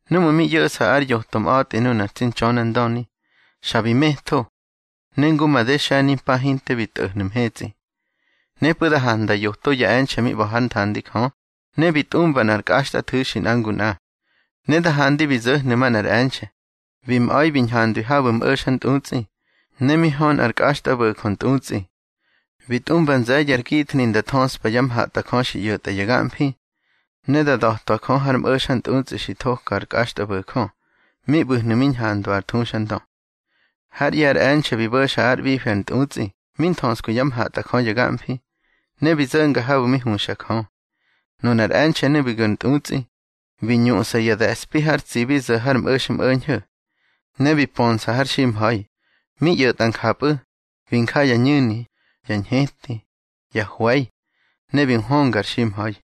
Númꞌu̱ mi ꞌyo̱ꞌsa ár yoto mꞌa̱tꞌi nunar tsi Ntxönandöni, xa bi metho, ne ngu made xe̱nimpa hinte bi tꞌo̱hnu̱ mhetsꞌi. Nepꞌu̱ da handa yoto ya e̱nxe̱ mi ꞌba̱ hár nthandi Jö, ne bi tꞌumba nꞌar kꞌaxtꞌathu̱xi nꞌa ngu nꞌa. Ne da handi bi zo̱hnu̱ manꞌar e̱nxe̱, bi mꞌa̱ bi ñhandwi habu̱ mꞌo̱xantꞌutsꞌi, ne mi hö nꞌar kꞌaxtꞌabo̱jö ntꞌutsꞌi. Bi tꞌumba nze̱ye̱ ar githni nda thöꞌspa ya mhatꞌajö xi ꞌyo̱tꞌa ya gamfi, ne da da̱twa Jö har mꞌo̱xantꞌutsꞌi xi thoka ar kꞌaxtꞌabo̱jö, mi ꞌbu̱hnu̱ mi ñhandwa ar thuxandö. Hár ꞌye̱ ar e̱nxe̱ bi bo̱xa ár ꞌbifi ar ntꞌutsꞌi mi nthöskwi yá mhatꞌajö ya gamfi, ne bi zo̱nga habu̱ mi huxa Jö. Nunar e̱nxe̱nu̱ bi gu̱ ar ntꞌutsꞌi, bi ñuꞌsa ya de̱spi har tsibi zo̱ har mꞌo̱xmꞌo̱ñho̱, ne bi pönsa har ximha̱i. Mi ꞌyo̱tꞌa njapꞌu̱, bi nja ya ñu̱ni, ya ñheti, ya hwe̱i, ne bi nhwönga ar ximha̱i.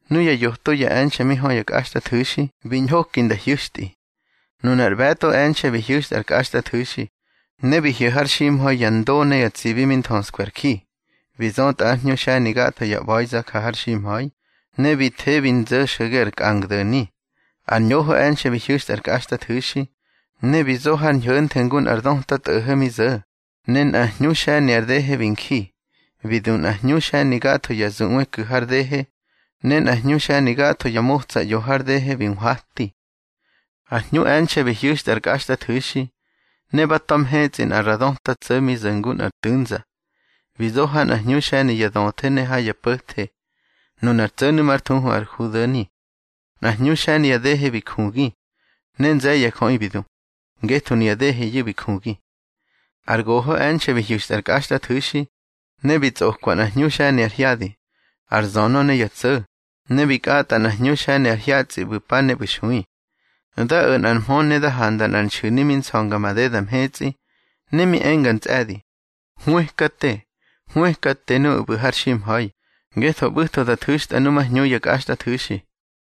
Nuya yoto ya e̱nxe̱ mi hö ya kꞌaxtꞌathu̱xi bi ñhoki nda hyu̱xtꞌi. Nunar ꞌbe̱tꞌo e̱nxe̱ bi hyu̱xtꞌa ár kꞌaxtꞌathu̱xi, ne bi hyo̱ har ximha̱i ya ndo ne ya tsibi mi nthöskwi ar ji. Bi zötꞌa ar hñu xe̱ni gatho ya ꞌba̱iza ja har ximha̱i, ne bi the bi nzo̱ xo̱ge ar kꞌangdo̱ni. Ar ñoho e̱nxe̱ bi hyu̱xtꞌa ár kꞌaxtꞌathu̱xi, ne bi zo har ñho̱nthe ngu nꞌar döta tꞌo̱ho̱ mi zo̱, ne nꞌa hñu xe̱ni ar dehe bi nji. Bi du nꞌa hñu xe̱ni gatho ya zuꞌwe ku̱ har dehe, ne nꞌa hñu xe̱ni gatho ya motsa ꞌyo har dehe bi nhwati. Ar hñu e̱nxe̱ bi hyu̱xtꞌa ár kꞌaxtꞌathu̱xi, ne ba ta̱ mhetsꞌi nꞌa ra döta tso̱ mi zo̱ ngu nꞌar tu̱nza. Bi zo ha nꞌa hñu xe̱ni ya döthe ne ha ya po̱the. Nunar tso̱nu̱ már thuhu ar Judo̱ni. Nꞌar hñu xe̱ni ya dehe bi jugi, ne nze̱ye̱ ya jöꞌi bi du, ngetho nuya deheyu̱ bi jugi. Ar goho e̱nxe̱ bi hyu̱xtꞌa ár kꞌaxtꞌathu̱xi, ne bi tsꞌokwa nꞌa hñu xe̱ni ar hyadi, ar zönö ne ya tso̱, ne bi kꞌatꞌa nꞌar hñu xe̱ni ar hyatsꞌi ꞌbu̱ pa ne ꞌbu̱ xui. Da o̱ nꞌar mhö ne da handa nꞌar nxu̱ni mi nsa̱nga madeda mhetsꞌi, ne mi enga ntsꞌe̱di: —Hwëkate, hwëkate nuꞌu̱ ꞌbu̱ har ximha̱i, ngetho ꞌbu̱tho da thu̱xtꞌa nu má hñu ya kꞌaxtꞌathu̱xi.